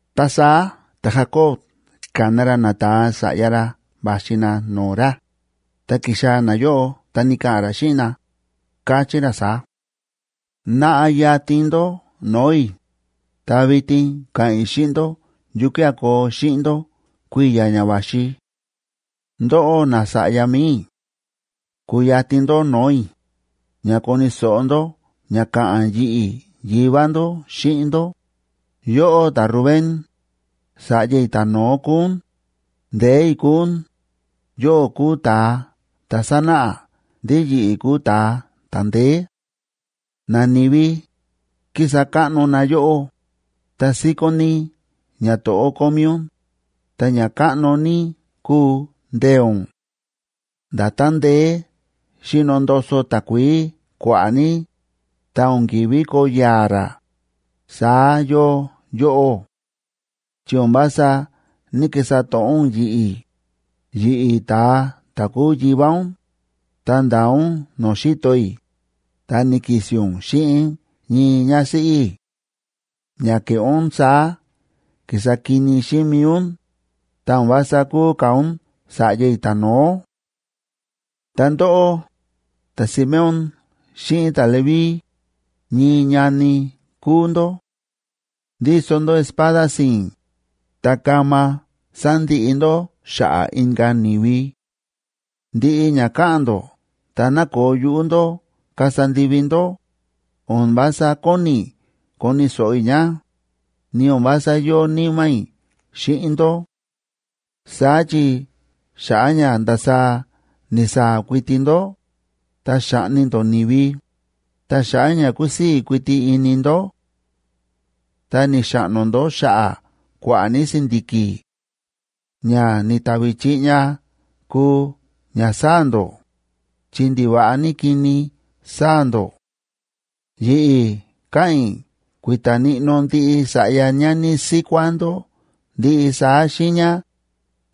Ta saá ta̱Jacob ka̱na ra nata̱a sa̱ꞌya ra va̱xi na no̱o̱ ra, ta ki̱xaa̱ nayóꞌo ta ni̱ka̱ꞌa̱n ra xíꞌin na, káchí ra saá: ―Naꞌa yatin ndó no̱o̱ i̱, ta vitin ka̱ꞌa̱n i̱ xíꞌin ndó yukía̱ koo xíꞌin ndó kui̱ya̱ ña va̱xi. Ndóꞌó nasa̱ꞌya mi̱i i̱, kuyatin ndó no̱o̱ i̱, ña koni̱ so̱ꞌo ndó ña ka̱ꞌa̱n yi̱ꞌi̱ yivá ndó xíꞌin ndó. Yóꞌó, ta̱Rubén, sa̱ꞌya i̱ ta̱no̱ó kúu ún, ndee̱ i̱ kúu ún; yóꞌó kúu ta̱a ta̱ sánáꞌa ndí yi̱ꞌi̱ kúu ta̱a ta̱ ndeé. Nani̱vi kísa káꞌno na yóꞌó, ta síkón ní ñato̱ꞌó kómí ún, ta ña káꞌno ní kúu ndee̱ ún. Nda̱tán ndeé xíno ndoso takuií kua̱ꞌa̱ ní, ta o̱n ki̱ví koo ya̱a̱ rá, saá yóo yóꞌó; chi o̱n vása ní‑kisa to̱ꞌó ún yi̱ꞌi̱, yi̱ꞌi̱ ta̱a ta̱ kúu yivá ún, ta nda̱a ún no̱o̱ xi̱to i̱, ta ni̱ki̱si̱n ún xíꞌin ñii ñásíꞌí i̱. Ña ke̱ꞌé ún saá ki̱sa kini xíꞌin mi̱i ún, ta o̱n vása kuu ka̱ ún sa̱ꞌya i̱ ta̱no̱ó. Ta ndóꞌó, ta̱Simeón xíꞌin ta̱Leví, ñii ñani kúu ndó; ndíso ndó espada si̱i̱n, ta kama sándiꞌi ndó xa̱ꞌa̱ inka̱ ni̱vi. Ndiꞌi ña káꞌa̱n ndó ta nákoo yuꞌú ndó kasa ndivi ndó, o̱n vása kóni i̱ koni̱ so̱ꞌo i̱ ña, ni o̱n vása yóo níma̱ i̱ xíꞌin ndó. Saá chi xa̱ꞌa̱ ña ndasaá ni̱saa̱ kuiti ndó, ta xa̱ꞌni ndó ni̱vi, ta xa̱ꞌa̱ ña kúsii̱ kuiti ini ndó, ta ni̱xaꞌno ndó xa̱ꞌa̱ kua̱ꞌa̱ ní si̱ndi̱ki̱. Ña ni̱tavi chiꞌña kúu ñasáa̱ ndó, chi ndiva̱ꞌa ní kini sáa̱ ndó. Yi̱ꞌi̱ káꞌa̱n i̱ kui̱ta̱ níꞌnó ndiꞌi sa̱ꞌya ñani síkuá ndó ndiꞌi saá xiiña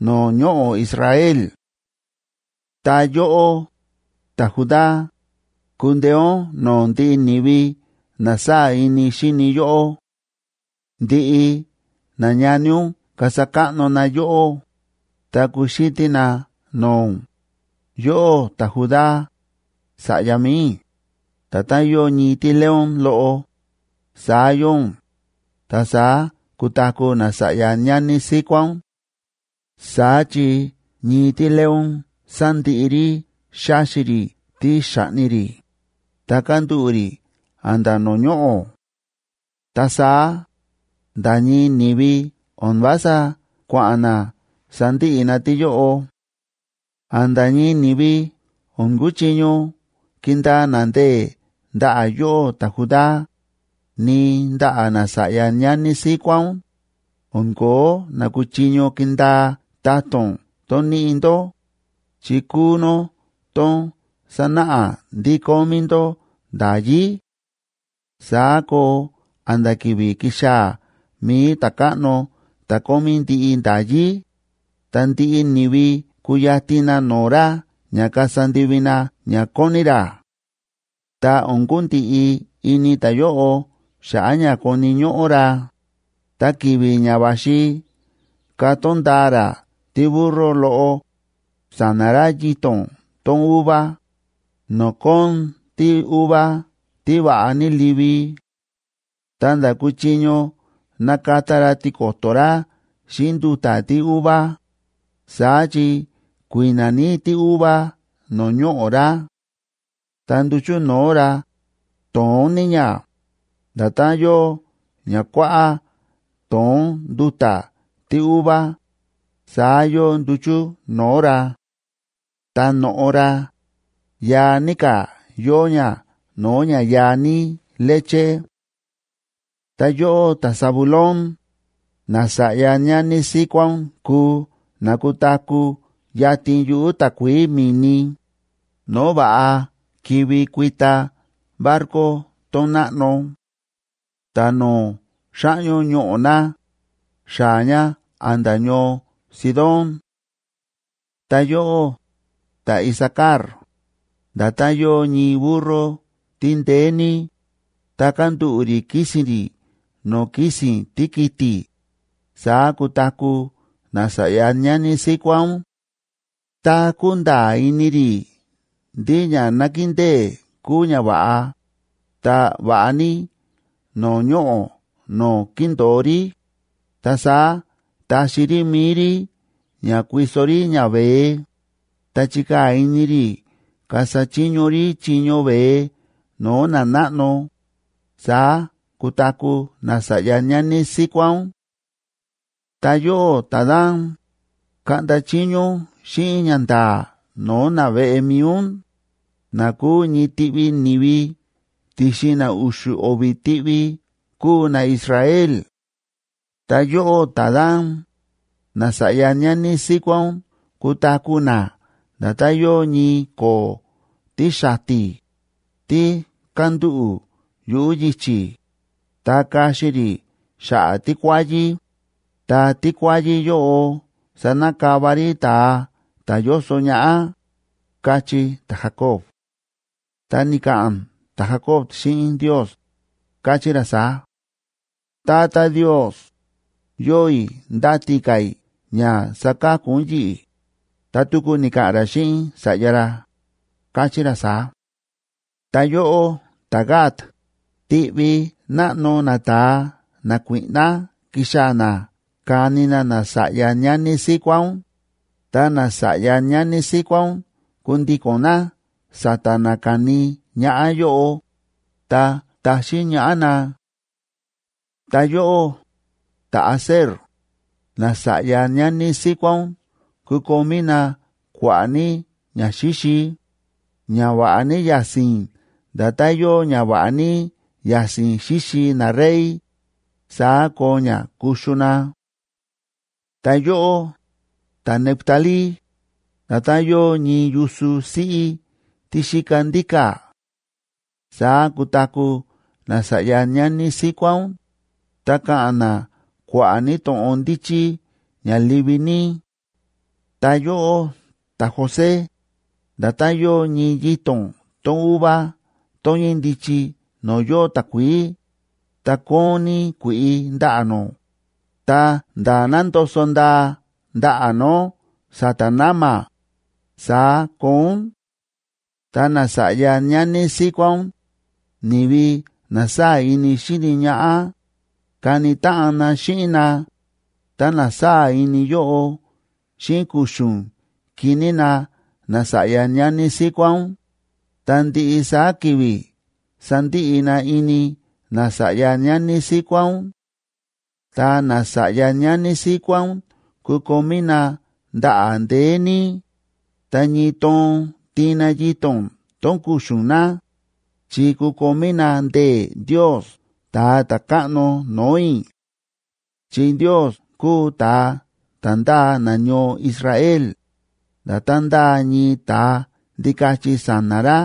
no̱o̱ ñoꞌo̱ Israel. Ta yóꞌó, ta̱Judá, kundeé ún no̱o̱ ndiꞌi ni̱vi na sáa̱ ini xíni yóꞌó. Ndiꞌi nañani ún kasa káꞌno na yóꞌó, ta kuxítí na no̱o̱ ún. Yóꞌó, ta̱Judá, sa̱ꞌya mi̱i i̱, nda̱tán yóo ñii tíleón loꞌo, saá yóo ún, ta saá kutaku̱ nasa̱ꞌya ñani síkuá ún. Saá chi ñii tíleón sándiꞌi rí xáxi rí tí xa̱ꞌni rí, ta kándúꞌu̱ rí a̱nda̱ no̱o̱ ñoꞌo̱. Ta saá nda̱ ñii ni̱vi o̱n vása kua̱ꞌa̱n na sandiꞌi na tíyóꞌo. A̱nda̱ ñii ni̱vi o̱n kuchiño kindaa na ndee̱ ndaꞌa̱ yóꞌó ta̱Judá, ni ndaꞌa̱ nasa̱ꞌya ñani síkuá ún, o̱n kóo na kuchiño kindaa ta̱to̱n tón níꞌi ndó, chi kúu nó tón sánáꞌa ndí kómí ndó nda̱yí; saá koo a̱nda̱ ki̱vi̱ kixaa̱ mi̱i ta̱káꞌno ta̱ kómí ndiꞌi nda̱yí, ta ndiꞌi ni̱vi kuyatin na no̱o̱ ra ña kasa ndivi na ña kóni ra. Ta o̱n kundiꞌi ini ta̱yóꞌo xa̱ꞌa̱ ña koni̱ ñóꞌó ra, ta ki̱vi̱ ña va̱xi katón ndaa ra tíburro loꞌo sa̱na̱ ra yito̱n tón uva, no̱o̱ kóon tíuva tí va̱ꞌa ní livi, ta nda̱ kuchiño nakata ra tiko̱to̱ ra xíꞌin nduta̱ tíuva, saá chi kui̱na̱ ní tíuva no̱o̱ ñoꞌo̱ ra. Ta nduchu̱ no̱o̱ ra, to̱ón ní ña, nda̱tán yóo ña kuáꞌá to̱ón nduta̱ tíuva, saá yóo nduchu̱ no̱o̱ ra. Ta no̱ꞌo ra, yaa ní ka̱ yóo ña no̱o̱ ña yaa ní leche. Ta yóꞌó, ta̱Zabulón, nasa̱ꞌya ñani síkuá ún kuu na kutaku̱ yatin yuꞌu̱ takuií mi̱ni, no̱o̱ va̱ꞌa kivi kuita barco tón náꞌno. Ta no̱o̱ xáꞌñó ñoꞌo̱ na, xaa̱ ña a̱nda̱ ñoo Sidón. Ta yóꞌó, ta̱Isacar, nda̱tán yóo ñii burro tí ndeé ní, ta kándúꞌu̱ rí kísi̱n rí no̱o̱ kísi̱n tíkiti̱, saá kutaku̱ nasa̱ꞌya ñani síkuá ún. Tá kúnda̱a̱ ini rí ndí ña nakindée kúu ñava̱ꞌa, ta va̱ꞌa ní no̱o̱ ñoꞌo̱ no̱o̱ kíndo̱o rí, ta saá taxi rí mi̱i rí ña kuiso rí ñaveé ta chikaa̱ ini rí kasa chiño rí chiño veé no̱o̱ nanáꞌno, saá kutaku̱ nasa̱ꞌya ñani síkuá ún. Ta yóꞌó, ta̱Dan, kaꞌnda chiño ún xíꞌin ñanda̱a̱ no̱o̱ naveꞌe mi̱i ún, na kúu ñii tiꞌvi ni̱vi ti̱xin na u̱xu̱ o̱vi̱ tiꞌvi kúu naIsrael. Ta yóꞌó, ta̱Dan, nasa̱ꞌya ñani síkuá ún kutaku̱ na nda̱tán yóo ñii ko̱o̱ tí xati̱, tí kándúꞌu̱ yuꞌu̱ yichi̱, ta kaxi rí xa̱ꞌa̱ tíkuáyí, ta tíkuáyí yóꞌo sanakava rí ta̱a ta̱ yóso ñaꞌá ―káchí ta̱Jacob. Ta ni̱ka̱ꞌa̱n ta̱Jacob xíꞌin Ndios, káchí ra saá: “Tata Ndios,a yóo i̱ ndáti ka̱ i̱ ña saka̱ku ún yi̱ꞌi̱.” Ta tuku ni̱ka̱ꞌa̱n ra xíꞌin sa̱ꞌya ra, káchí ra saá: Ta yóꞌó, ta̱Gad, tiꞌvi náꞌno nata̱a nakuíꞌná kixaa̱ na kani na nasa̱ꞌya ñani síkuá ún, ta nasa̱ꞌya ñani síkuá ún kundiko̱n na sa̱ta̱ na kani ñaꞌá yóꞌo, ta taxín ñaꞌá na. Ta yóꞌó, ta̱Aser, nasa̱ꞌya ñani síkuá ún kukomí na kua̱ꞌa̱ ní ñaxíxi, ña va̱ꞌa ní ya̱si̱n nda̱tán yóo ña va̱ꞌa ní ya̱si̱n xíxi narey, saá koo ña kuxu na. Ta yóꞌó, ta̱Neftalí, nda̱tán yóo ñii yusu siꞌí tí xíka ndíka̱, saá kutaku̱ nasa̱ꞌya ñani síkuá ún, ta ka̱ꞌa̱n na kua̱ꞌa̱ ní to̱ꞌon ndíchí ña livi ní. Ta yóꞌó, ta̱José, nda̱tán yóo ñii yito̱n tón uva tón ñíndichi no̱o̱ yóo takuií, ta kóon ní kui̱ꞌi ndaꞌa̱ nó, ta nda̱ nándoso̱ ndaa ndaꞌa̱ nó sa̱ta̱ na̱ma̱, saá koo ún. Ta nasa̱ꞌya ñani síkuá ún, ni̱vi na sáa̱ ini xíni ñaꞌá, kani táꞌan na xíꞌin na, ta na sáa̱ ini yóꞌo xíꞌin kuxu̱n kiní na nasa̱ꞌya ñani síkuá ún, ta ndiꞌi saá ki̱vi̱ sandiꞌi na ini nasa̱ꞌya ñani síkuá ún. Ta nasa̱ꞌya ñani síkuá ún kukomí na ndaꞌa̱ ndeé ní, ta ñii toon tiin na yito̱n tón kuxu̱n na, chi kukomí na ndee̱ Ndios Ta̱a ta̱Káꞌno no̱o̱ i̱. Chi Ndios kúu ta̱a ta̱ ndáa nañoo Israel, nda̱tán ndáa ñii ta̱a ndikachi sa̱na̱ ra.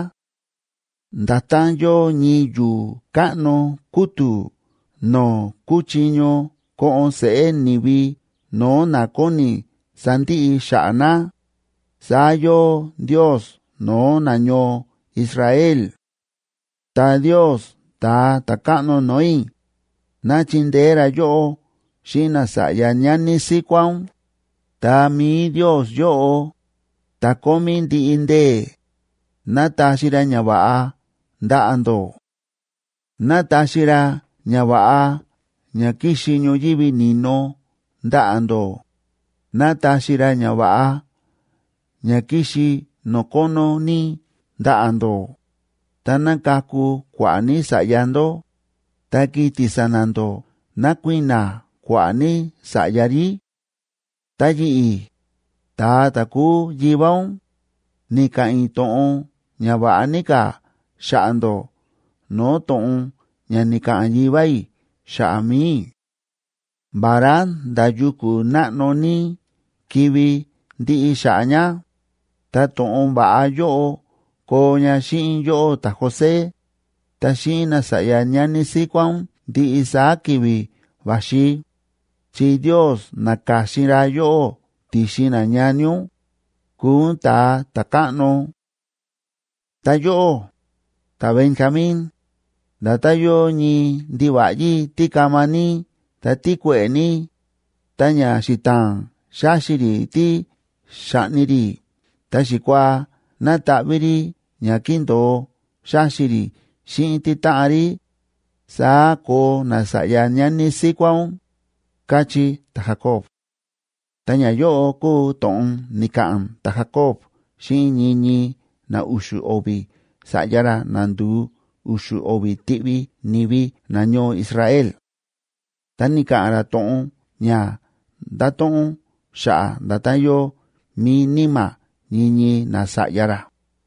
Nda̱tán yóo ñii yu̱u̱ káꞌno kútu̱ no̱o̱ kúchiño ko̱ꞌo̱n seꞌé ni̱vi no̱o̱ na kóni sandiꞌi xa̱ꞌa̱ na, saá yóo Ndios no̱o̱ nañoo Israel. Ta Ndios ta̱a ta̱káꞌno no̱o̱ i̱, ná chindeé ra yóꞌó xíꞌin nasa̱ꞌya ñani síkuá ún, ta mi̱i Ndios yóꞌo, ta̱ Kómí Ndiꞌi Ndee̱, ná taxi ra ñava̱ꞌa ndaꞌa̱ ndó. Ná taxi ra ñava̱ꞌa ña kíxi ñoyívi ni̱no ndaꞌa̱ ndó, ná taxi ra ñava̱ꞌa ña kíxi no̱o̱ kónó ní ndaꞌa̱ ndó, ta ná kaku kua̱ꞌa̱ ní sa̱ꞌya ndó, ta kiti̱ sa̱na̱ ndó ná kui̱na̱ kua̱ꞌa̱ ní sa̱ꞌya rí. Ta yi̱ꞌi̱, ta̱a ta̱ kúu yivá ún, ni̱ka̱ꞌa̱n i̱ to̱ꞌon ña va̱ꞌa ní ka̱ xa̱ꞌa̱ ndó no̱o̱ to̱ꞌon ña ni̱ka̱ꞌa̱n yivá i̱ xa̱ꞌa̱ mi̱i i̱. Vará nda̱ yuku̱ náꞌno ní kivi ndiꞌi xa̱ꞌa̱ ña, ta to̱ꞌon va̱ꞌa yóꞌo koo ña xíꞌin yóꞌó ta̱José, ta xíꞌin nasa̱ꞌya ñani síkuá ún ndiꞌi saá ki̱vi̱ va̱xi, chi Ndios na̱ka̱xin ra yóꞌó ti̱xin nañani ún, kúu ún ta̱a ta̱káꞌno. Ta yóꞌó, ta̱Benjamín, nda̱tán yóo ñii ndiva̱ꞌyí tí kama ní ta tí kue̱ꞌe̱ ní, ta ña xita̱a̱n xáxi rí tí xa̱ꞌni rí ta xikuaa nátaꞌví rí ña kíndo̱o xáxi rí xíꞌin títáꞌan rí, saá koo nasa̱ꞌya ñani síkuá ún ―káchí ta̱Jacob. Ta ñayóꞌo kúu to̱ꞌon ni̱ka̱ꞌa̱n ta̱Jacob xíꞌin ñii ñii na u̱xu̱ o̱vi̱ sa̱ꞌya ra na nduu u̱xu̱ o̱vi̱ tiꞌvi ni̱vi nañoo Israel. Ta ni̱ka̱ꞌa̱n ra to̱ꞌon ña nda̱to̱ꞌon xa̱ꞌa̱ nda̱tán yóo mi̱i níma̱ ñii ñii nasa̱ꞌya ra.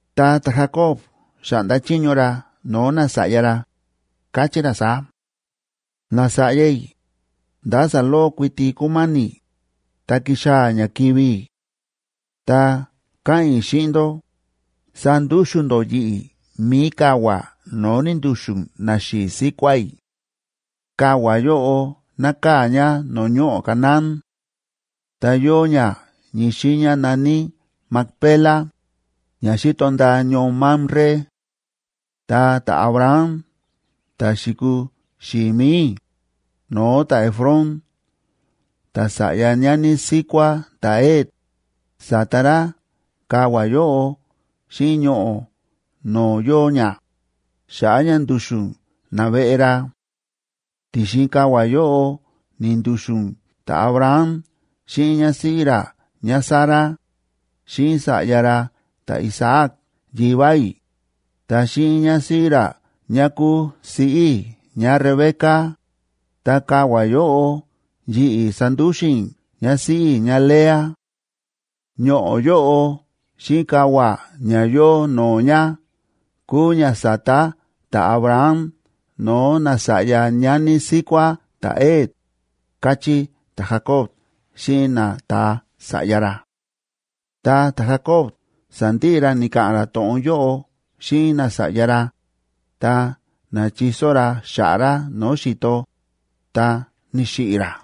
Ta ta̱Jacob xa̱ꞌnda chiño ra no̱o̱ nasa̱ꞌya ra, káchí ra saá: ―Nasa̱ꞌya i̱, nda̱ saloꞌo kuiti kúmáni̱, ta kixaa̱ ña kivi̱ i̱. Ta káꞌa̱n i̱ xíꞌin ndó, sandúxu̱n ndó yi̱ꞌi̱ mi̱i kavua̱ no̱o̱ ni̱ndu̱xu̱n naxi̱i̱ síkuá i̱. Kavua̱ yóꞌo nákaa̱ ña no̱o̱ ñoꞌo̱ Canaán; ta yóo ña ñii xiiña na̱ní Macpela, ña xíto ndaa ñoo Mamre. Ta ta̱Abraham ta̱ xi̱kuu xi̱i̱ mi̱i i̱, no̱o̱ ta̱Efrón ta̱sa̱ꞌya ñani síkuá ta̱Het, sa̱ta ra kavua̱ yóꞌo xíꞌin ñoꞌo̱ no̱o̱ yóo ña, xa̱ꞌa̱ ña ndu̱xu̱n naveꞌe ra. Ti̱xin kavua̱ yóꞌo ni̱ndu̱xu̱n ta̱Abraham xíꞌin ñásíꞌí ra ñáSara, xíꞌin sa̱ꞌya ra ta̱Isaac yivá i̱, ta xíꞌin ñásíꞌí ra ñá kúu siꞌí i̱ ñáRebeca, ta kavua̱ yóꞌo yi̱ꞌi̱ sa̱ndúxu̱n i̱ ñásíꞌí i̱ ñáLea. Ñoꞌo̱ yóꞌo xíꞌin kavua̱ ña yóo no̱o̱ ña kúu ña sa̱ta ta̱Abraham no̱o̱ nasa̱ꞌya ñani síkuá ta̱Het ―káchí ta̱Jacob xíꞌin nata̱a sa̱ꞌya ra. Tá ta̱Jacob sa̱ndiꞌi ra ni̱ka̱ꞌa̱n ra to̱ꞌon yóꞌo xíꞌin nasa̱ꞌya ra, ta na̱chiso ra xa̱ꞌa̱ ra no̱o̱ xi̱to, ta ni̱xiꞌi̱ ra.